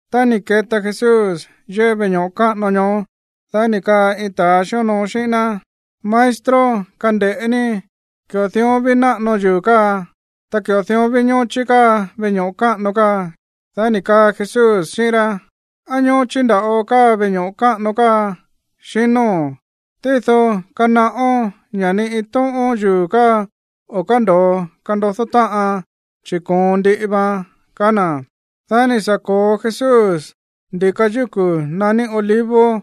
Tá ni̱ keta Jesús yéꞌé veꞌe ño̱ꞌo káꞌano ñoó, dá ni̱ kaa iin ta̱a xíonoo xíꞌín ná: ―Maestro, kande̱ꞌé ní, ki̱ꞌo dión ví náꞌano yuu̱ káa, ta ki̱ꞌo dión ví ñóchí káa veꞌe ño̱ꞌo káꞌano káa. Dá ni̱ kaa Jesús xíꞌín rá: ―¿Á ñóchí nda̱ꞌo káa veꞌe ño̱ꞌo káꞌano káa, xinóo̱n? Tído kanaꞌón ña̱ ni iin tóꞌón yuu̱ káa o̱ kándo̱o kandodó táꞌan, chi̱ koon ndiꞌi vaan ―kaá na̱. Dá ni̱ sa̱ ko̱o Jesús ndi̱ka yúku̱ naní Olivos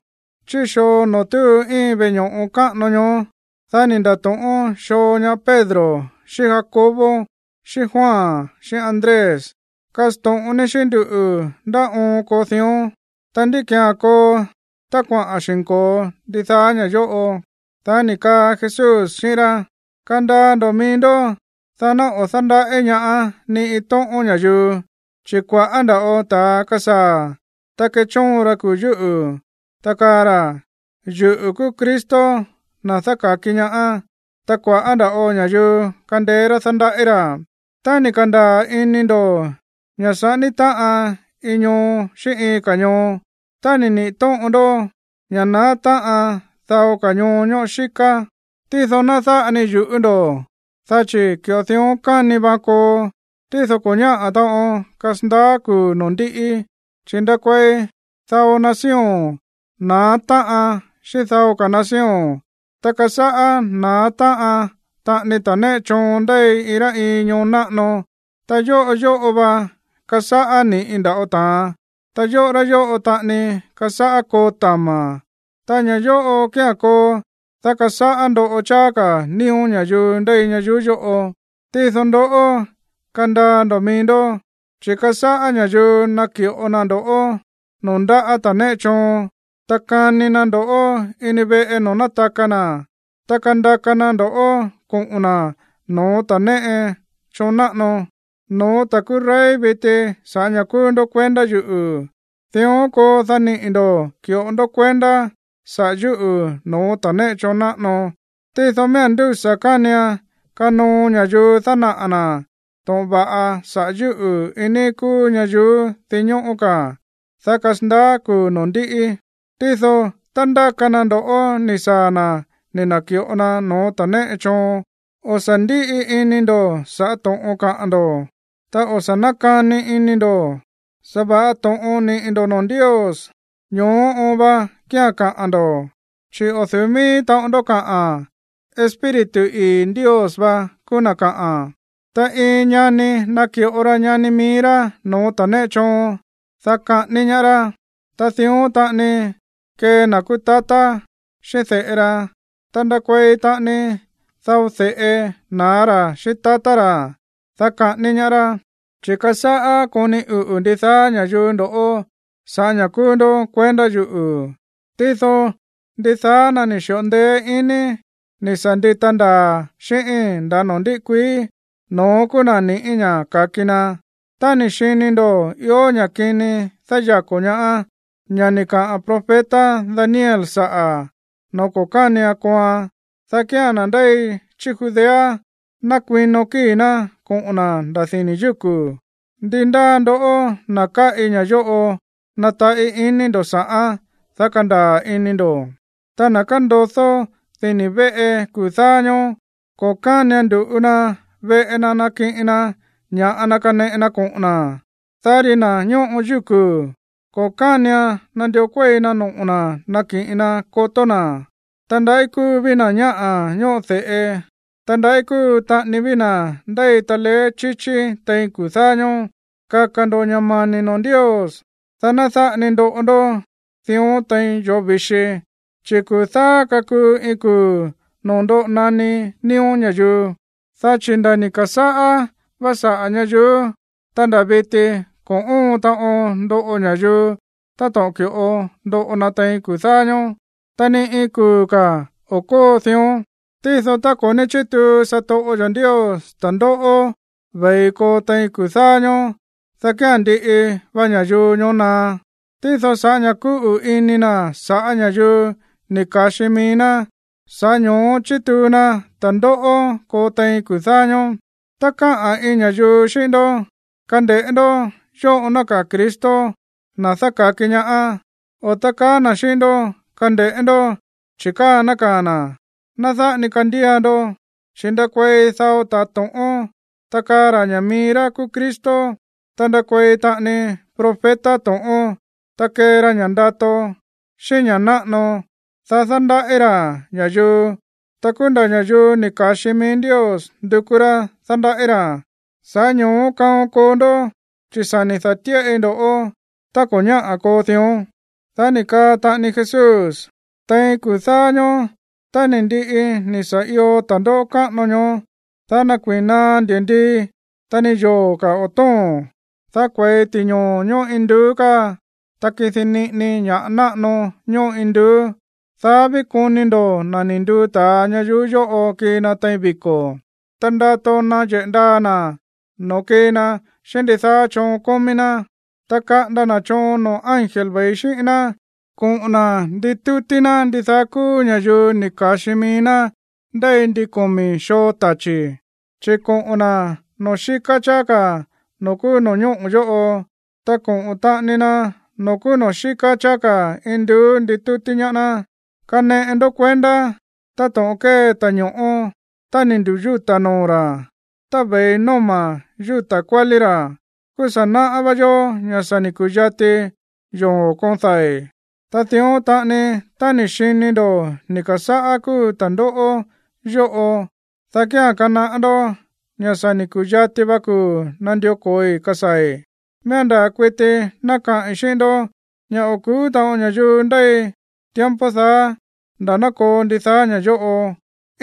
chí xoo noo̱ túu íin veꞌe ño̱ꞌo káꞌano ñoó. Dá ni̱ nda̱to̱ꞌón xoo ñaá Pedro xíꞌín Jacobo xíꞌín Juan xíꞌín Andrés: ―Kasto̱ꞌon ní xíꞌín nduꞌu̱ ndá oon koo dión. Ta, ¿ndí ki̱án koo tá kuaꞌa̱n xi̱nko̱o ndidaá ña̱ yóꞌo? Dá ni̱ kaa Jesús xíꞌín rá: ―Kandaa ndo̱ mií ndó, dá ná o̱ dándaꞌí ñaá ni iin tóꞌón ña̱yuu. Chi̱ kua̱ꞌá nda̱ꞌo ta̱a kasaa̱, ta kechóon ra kuu̱ yúꞌu̱, ta kaa ra̱: “Yuꞌu̱ kúú Cristo, na̱ dáka̱ki ñaá.” Ta kua̱ꞌá nda̱ꞌo ña̱yuu kandeé rá dándaꞌí ra̱. Tá ni̱ ka̱ndaa̱ ini ndo̱ ña̱ saꞌání táꞌan iin ñoo xíꞌín iin ka̱ ñoo, ta ni̱ niꞌi̱ tóꞌon ndó ña̱ naá táꞌan dao ka̱ ñoo ñóꞌo xíká, tído ná dáꞌa ni yu̱ꞌú ndo̱, dá chi̱ ki̱ꞌo dión káni vaan koo, tído ko̱ ñáꞌa̱ taꞌon kasandaá kuu̱ noo̱ ndíꞌí. Chi̱ ndakuei dao nación na̱á táꞌan xíꞌín dao ka̱ nación, ta kasáꞌá na̱á táꞌan taꞌani ta̱ néꞌe choon ndéi iin rá iin ñoo náꞌano. Ta yóꞌo yóꞌo va kasáꞌá ni̱ꞌi nda̱ꞌo ta̱an. Ta yóꞌo rá yóꞌo taꞌani kasáꞌá koo tama̱. Ta ña̱ yóꞌo kía̱n koo, dá kasáꞌá ndoꞌo cháá ka̱ nío̱ ña̱yuu ndéi ñayuú yóꞌo. ’Tído ndoꞌó, kandaa ndo̱ mií ndó, chi̱ kasáꞌá ña̱yuu naki̱ꞌo na ndo̱ꞌó noo̱ ndáꞌa̱ ta̱ néꞌe choon. Ta kani na ndo̱ꞌó ini veꞌe noo̱ nátaka na̱. Ta kandaka na ndo̱ꞌó koꞌo̱n na̱ no̱ó ta̱ néꞌe choon náꞌano, no̱ó ta̱ kúú rey viti sa̱ꞌá ña̱ kúú ndó kuendá yuꞌu̱. Dión koo, dá niꞌi̱ ndo̱ ki̱ꞌo ndó kuendá saꞌa̱ yúꞌu̱ no̱ó ta̱ néꞌe choon náꞌano. Tído miía̱n ndúsa̱ kánian kanoo ña̱yuu dánaꞌa̱ na̱ to̱ꞌon va̱ꞌa saꞌa̱ yúꞌu̱ iin níí kúú ñayuú dinñóꞌó ka̱, dá kasandaá kuu̱ noo̱ ndíꞌí. Tído, tá ndáka na ndo̱ꞌó ni̱ saa̱ na̱ ni̱ na̱ki̱ꞌo na no̱ó ta̱ néꞌe choon, o̱ sa̱ ndíꞌi ini ndo̱ sa̱ꞌá to̱ꞌon kaꞌa̱n ndo̱, ta o̱ sa̱ nákani ini ndo̱. Sa̱va̱ꞌa to̱ꞌon niꞌi̱ ndo̱ noo̱ Ndios, ño̱ó oon va kía̱n kaꞌa̱n ndo̱. Chi̱ o̱ du̱ú mií taꞌon ndó kaꞌa̱n. Espíritu ii̱ Ndios va kúú na̱ kaꞌa̱n. ’Ta iin ñani naki̱ꞌo ra ñani mií rá no̱ó ta̱ néꞌe choon, dá kaꞌání ñaá rá. Ta dión taꞌani kee na̱ kúú tatá xíꞌín de̱ꞌe ra. Ta ndakuei taꞌani dao de̱ꞌe na̱á ra̱ xíꞌín tatá ra̱, dá kaꞌání ñaá rá. Chi̱ kasáꞌá koni uꞌu̱ ndidaá ña̱yuu ndo̱ꞌó sa̱ꞌá ña̱ kúú ndó kuendá yuꞌu̱. Tído ndidaá na̱ ni̱ xi̱ꞌo ndeé iní ni̱ sa̱ ndita ndaa̱ xíꞌíi̱n nda̱ noo̱ ndíꞌí kuií, no̱ón kúú na̱ niꞌi̱ ña̱ ka̱ki na. ’Tá ni̱ xini ndo̱ ió ña̱ kini dáyako̱ ñaá, ña̱ ni̱ kaꞌa̱n profeta Daniel saꞌa̱, noo̱ ko̱ kánian kooan, dá kía̱n na̱ ndéi chí Judea ná kuino kíi̱ ná koꞌo̱n na̱ nda̱ dini̱ yúku̱. (Ndi ndáa ndoꞌó, na̱ káꞌi ña̱ yóꞌo, nataꞌí iní ndo̱ sa̱ꞌán, dá kandaa̱ ini ndo̱.) Ta na̱ kándodó dini̱ véꞌe kuu̱ dáá ñóó, ko̱ kánian ndu̱ꞌu na veꞌe na nakiꞌin na ña̱ꞌa na kaneꞌe na koꞌo̱n na̱. Dá ri na̱ ñóꞌo yúku̱, ko̱ kánian nandió kuéi na noꞌo̱ na̱ nakiꞌin na kotó na̱. Ta, ¡ndaꞌí kúu ví na̱ ñáꞌa̱ ñóꞌo de̱ꞌe, ta ndaꞌí kúu taꞌani ví na̱ ndéi taleé chíchí tein kuu̱ dáá ñóó! Kaka̱ ndo̱ ña̱ mani̱ noo̱ Ndios, dá ná dáꞌa ni ndoꞌo ndó dión tein yoo̱ vi̱xi. Chi̱ kuu̱ dáá kakuu iin kuu̱ noo̱ ndoꞌo naní nío̱ ña̱yuu. Dá chi̱ nda̱ ni̱ ka̱sáꞌá vá saꞌa̱ ñayuú, ta nda̱ viti ko̱ óon taꞌon ndoꞌo ña̱yuu táto̱ꞌon ki̱ꞌo ndoꞌo na tein kuu̱ dáá ñóó. Ta ni iin kuu̱ ka̱ o̱ kóo dión. Tído tá ko̱ ní chítuu satoꞌo yo̱ Ndios ta̱ndóꞌó ve̱i koo tein kuu̱ dáá ñóó, dá kía̱n ndiꞌi va ña̱yuu ñoó na̱á. Tído sa̱ꞌá ña̱ kúꞌu̱ ini na̱ sa̱ꞌá ña̱yuu ni̱ ka̱xi mií ná, sa̱ꞌá ño̱ó chituu na ta̱ndóꞌó koo tein kuu̱ dáá ñóó. ’Tá kaꞌa̱n iin ña̱yuu xíꞌín ndó: “Kande̱ꞌé ndó, yóꞌo nákaa̱ Cristo, na̱ dáka̱ki ñaá”, o tá kaa na̱ xíꞌín ndó: “Kande̱ꞌé ndó, chi̱ káa nákaa̱ na̱”, ná dáꞌa ni kandía ndó. Chi̱ ndakuei dao ta̱a to̱ꞌón, ta kaa ra̱ ña̱ mií rá kúú Cristo. Ta ndakuei taꞌani profeta to̱ꞌón. Ta kee ra ña̱ꞌa ndato, xíꞌín ña̱ꞌa náꞌano, dá dándaꞌí ra̱ ña̱yuu. Ta kúú nda̱ ña̱yuu ni̱ ka̱xi mií Ndios ndukú rá dándaꞌí ra̱. Sa̱ꞌá ño̱ó kaon koo ndó, chi̱ sa̱ ni̱ da̱tíꞌai ndo̱ꞌó tá ko̱ ñáꞌa̱ koo dión. Dá ni̱ kaa taꞌani Jesús: ―Tein kuu̱ dáá ñóó, tá ni̱ ndiꞌi ni̱ sa̱ io ta̱ndóꞌó káꞌano ñoó, dá nakuiin naá ndi̱ndii, ta ni yoo̱ ka̱ o̱ tóo̱n. Dá kue̱i ti̱ñoo̱ ñóꞌo induú káa, ta kidi niꞌini ña̱ náꞌano ñóꞌo induú. Dá ví koni ndo̱ na̱ ni̱ nduu ta̱a ñayuú yóꞌo kii na tein viko̱, ta ndato nayeꞌe̱ ndaa na̱ noo̱ kii na xíꞌín ndidaá choon kómí ná. Ta kaꞌanda na̱ choon noo̱ ángel ve̱i xíꞌín ná koꞌo̱n na̱ nakuaka na ndidaá kúú ña̱yuu ni̱ ka̱xi mií ná ndéi ndin komi̱ xoo tachi̱, chi̱ koꞌo̱n na̱ noo̱ xíká cháá ka̱ noo̱ kúú no̱ñóꞌo̱ yóꞌo, ta koꞌo̱n taꞌani na noo̱ kúú noo̱ xíká cháá ka̱ induú dá nditútí ná noo̱ Jesús. ’Kaneꞌe ndó kuendá táto̱ꞌon kée ta̱ño̱ꞌó. Tá ni̱ ndu̱yúta̱ noo̱ ra̱, ta ve̱i nóma̱ yúta̱ kuálí ra̱, kúú sa̱ náꞌá vá yó ña̱ sa̱ ni̱ ku̱yati yoo̱ koon dai̱. Ta dión taꞌani, tá ni̱ xini ndo̱ ni̱ ka̱sáꞌá kúu ta̱ndóꞌó yóꞌo, dá kía̱n kanaꞌá ndó ña̱ sa̱ ni̱ ku̱yati va kuu̱ nandió ko̱oi kasaa̱i̱. ’Miía̱n ndaa̱ kuiti ná kaꞌi̱n xíꞌín ndó ña̱ o̱ ku̱ú taꞌon ña̱yuu ndéi tiempo daá nda̱ ná koo ndidaá ña̱ yóꞌo.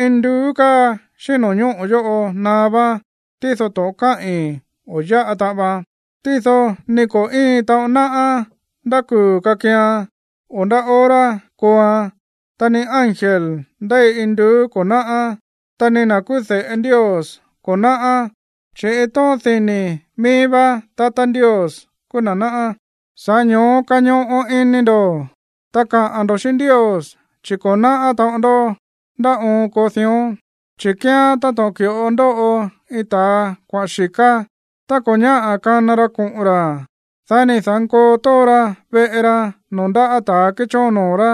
Induú káa xíꞌín no̱ñóꞌo̱ yóꞌo naá váán. Tído to̱ꞌon káꞌi̱n, o̱ yáꞌa taꞌan vaan. ’Tído ni ko̱ íin taꞌon náꞌá ndá kuu̱ kakian, o ndá hora kooan, ta ni ángel ndéi induú ko̱ náꞌá, ta ni na̱ kúú de̱ꞌe Ndios ko̱ náꞌá, chi̱ iin tóꞌón dini̱ míí vá tatá Ndios kúú na̱ náꞌá. Sa̱ꞌá ño̱ó kañoꞌo ini ndo̱, ta kaꞌa̱n ndo̱ xíꞌín Ndios, chi̱ ko̱ náꞌá taꞌon ndó ndá oon koo dión. ’Chi̱ kíán táto̱ꞌon ki̱ꞌo ndóꞌo iin ta̱a kuaꞌa̱n xi̱ká. Tá ko̱ ñáꞌa̱ kana ra koꞌo̱n ra̱, dá ni̱ da̱nkoo tóo ra veꞌe ra noo̱ ndáꞌa̱ ta̱a kéchóon noo̱ rá.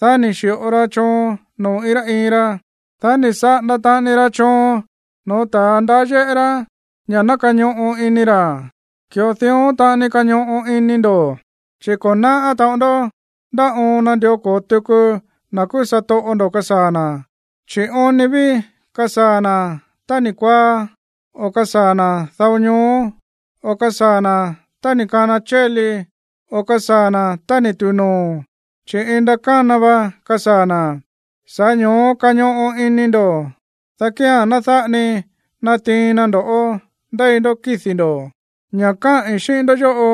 Dá ni̱ xi̱ꞌo ra choon noo̱ iin rá iin ra. Dá ni̱ saꞌanda taꞌani ra choon no̱ó ta̱a ndaá yéꞌé rá ña̱ ná kañoꞌo ini ra̱. Ki̱ꞌo dión taꞌani kañoꞌo ini ndo̱, chi̱ ko̱ náꞌá taꞌon ndó ndá oon nandió ko̱o tuku na̱ kúú satoꞌo ndo̱ kasaa̱ na̱. Chi̱ oon ni ví kasaa̱ na̱ tá ni̱ kuaá, o kasaa̱ na̱ dao ñoó, o kasaa̱ na̱ tá ni̱ kana chéli, o kasaa̱ na̱ tá ni̱ tu̱u noo̱. Chi̱ iin ndakána va kasaa̱ na̱, sa̱ꞌá ño̱ó kañoꞌo ini ndo̱, dá kía̱n ná dáꞌa ni natiin na ndo̱ꞌó ndéi ndó kídi̱ ndo̱. Ña̱ káꞌi̱n xíꞌín ndoꞌó yóꞌo,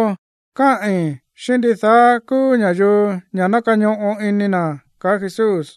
káꞌi̱n xíꞌín ndidaá kúú ña̱yuu ña̱ ná kañoꞌo ini na̱ ―kaá Jesús.